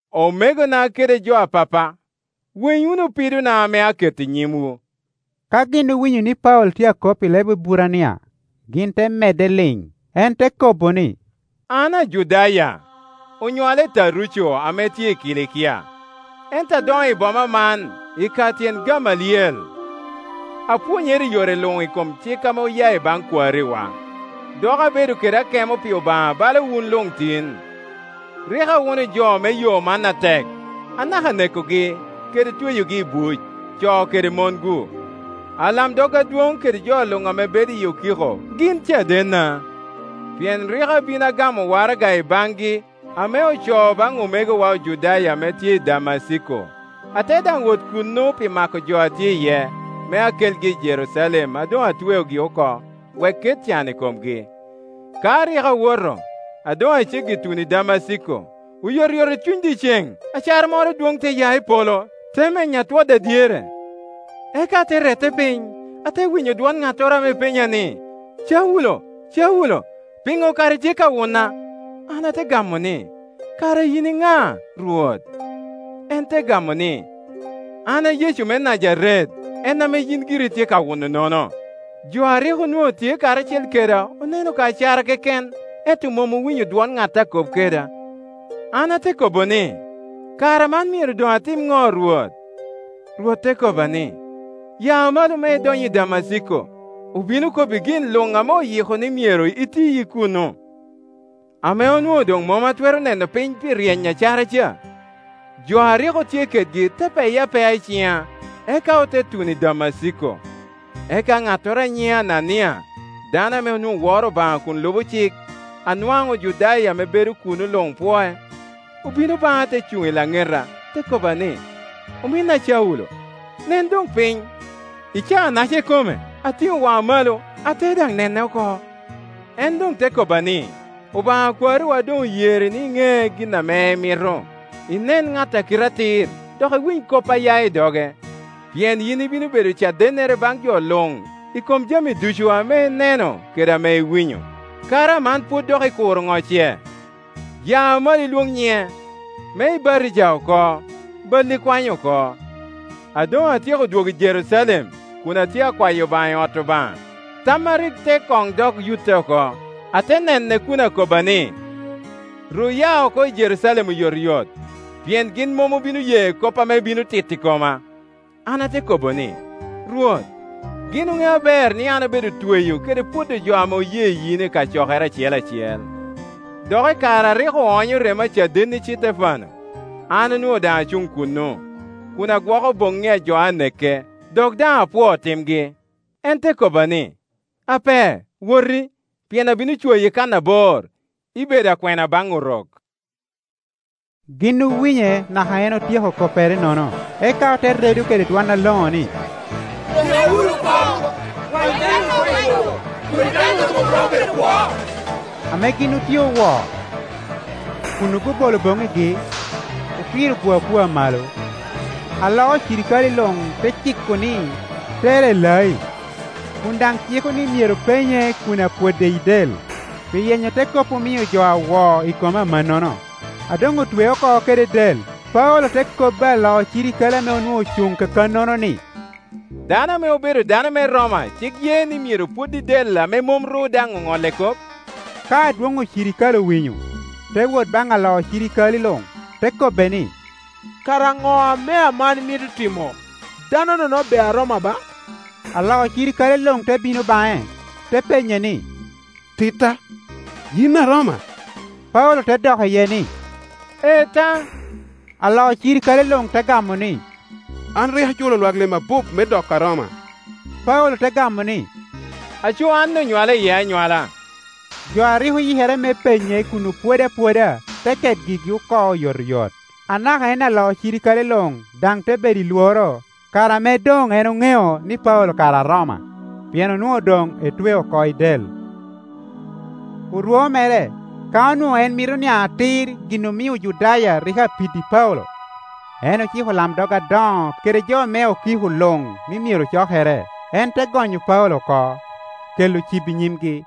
“Omegona kede jo a pappa, winy wunu pidona ame aketo i nyimwu.” Ka gin owinyo ni Paulo tye akop i leb Eburania, gin te medde liŋ. En te kobo ni, “An Ajudaya; onywala i Taruco ame tye i Kilikia, ento adoŋo i boma man i ka tyen Gamaliel. Apwonyere i yore luŋ i kom cik ame oya i baŋ kwariwa, dok abedo kede akemo pi Obaŋa bala wun luŋ tin. Rik awuno jo me Yo man atek, anaka nekogi, kede tweyogi i buc, co kede mongu. Alamdog adwoŋ kede jo luŋ ame bedo i okiko gin cadenna. Pien rik abin agamo waraga i baŋgi ame ocoo baŋ omegowa Ojudaya ame tye i Damaciko, ate daŋ wot kuno pi mako jo a tye iye, me akelgi i Jerucalem a doŋ atweogi oko, wek ket can i komgi. “Ka rik awoto, a doŋ a ceggi tuno i Damaciko, oyotoyot i cuny dyeceŋ acara moro adwoŋ te ya i polo, te menya twoda dyere. Eka ate rette piny, ate winyo dwon ŋattoro ame penya ni, ‘Caulo, Caulo, piŋo kara itye ka wuna?’ An ate gamo ni, ‘Kara yin iŋa, Rwot?’ En te gamo ni, ‘An a Yecu me Najaret, en ame yin giri itye ka wunonono.’ Jo a rik onwoŋo tye karacel keda oneno ka acara keken, ento mom owinyo dwon ŋat a kop keda. An ate kobo ni, ‘Kara man myero doŋ atim ŋo, Rwot?’ Rwot te kobba ni, ‘Ya malo me idony i Damaciko; obino kobbi gin luŋ ame oyiko ni myero iti i kuno.’” Ame onwoŋo doŋ mom atwero neno piny pi ryeny me acara ca, jo a rik otye kedgi te peya apea i ciŋa, eka ote tuno i Damaciko. “Eka ŋattoro a nyiŋe Anania, dano ame onwoŋo woro Obaŋa kun lubo cik, a nwaŋ Ojudaya ame bedo kuno luŋ pwoc, obino baŋa te cuŋ i laŋeta, te kobba ni, ‘Ominna Caulo, nen doŋ piny.’ I caa-naca ikome, atiŋo waŋa malo, ate daŋ nene oko. En doŋ te kobba ni, ‘Obaŋa a kwariwa doŋ oyeri ni iŋe gin ame emito, inen ŋat a Kite Atir, dok iwiny kop aya i doge, pien yin ibino bedo cadennere baŋ jo luŋ i kom jami ducu ame ineno kede ame iwinyo. Kara aman pwod dok ikuro ŋo ce? Ya malo ilwoŋ nyiŋe, me ibatija oko, balli kwany oko. “A doŋ atyeko dwogo i Jerucalem, kun atye akwayo Obaŋa i ot Obaŋa, tamma rik te koŋ dok yutte oko, ate nene kun akobba ni, ‘Ru ya oko i Jerucalem oyotoyot, pien gin mom obino ye kop ame ibino tito i koma,’ An ate kobo ni, ‘Rwot, gin oŋeo aber ni an abedo tweyo kede pwodo jo ame oye yin i kacokere acel acel. Dok i kare arik oonyo remo a cadenni Citefano, an onwoŋo daŋ acuŋ kuno, kun agwoko boŋŋi ajo aneke, dok daŋ apwoo timgi.’ En te kobba ni, ‘Ape, woti; pien abino cwayi kan abor, ibedo akwena baŋ Orok.’” Gin owinye naka en otyeko koppere-nono, eka ote redo kede dwon aloŋo ni, “Neke wunu oko! Kwany dano-nono oko i lobo, kodi dano-nono mom romo bedo kwo.” Ame gin otye owo, kun obobolo boŋŋigi, okiro-gu apua malo, alo ocirikale luŋ te ciko ni tere i lai, kun daŋ ciko ni myero penye kun apwode i del, pi yenyo te kop omio jo awo i kome amannono. A doŋ otwee oko kede del, Paulo te kobbi alo cirikale ame onwoŋo ocuŋ kakannono ni, “Dano ame obedo dano me Roma cik ye ni myero pwod i del, ame mom ru daŋ oŋolle kop?” Ka adwoŋ ocirikale owinyo, te wot baŋ alo cirikale luŋ, te kobbe ni, “Kara ŋo ame aman imito timo? Dano-nono be Aroma ba.” Alo cirikale luŋ te bino baŋe, te penye ni, “Titta, yin Aroma?” Paulo te dok iye ni, “Ee ta.” Alo cirikale luŋ te gamo ni, “An rik aculo lwak lim abup me doko Aroma.” Paulo te gamo ni, “Aco an onywala iye anywala.” Jo a rik oyikere me penye kun opwode apwoda te ket gigi oko oyotoyot; anaka en alo cirikale luŋ daŋ te bedo i lworo kare ame doŋ en oŋeo ni Paulo kara Aroma, pien onwoŋo doŋ etweo oko i del. Orwo mere, ka onwoŋo en mito niaŋ atir gin omio Ojudaya rik apiddi Paulo, en ociko olamdog adoŋo kede jo me okiko luŋ ni myero ocokere. En te gonyo Paulo oko, kela cibo i nyimgi.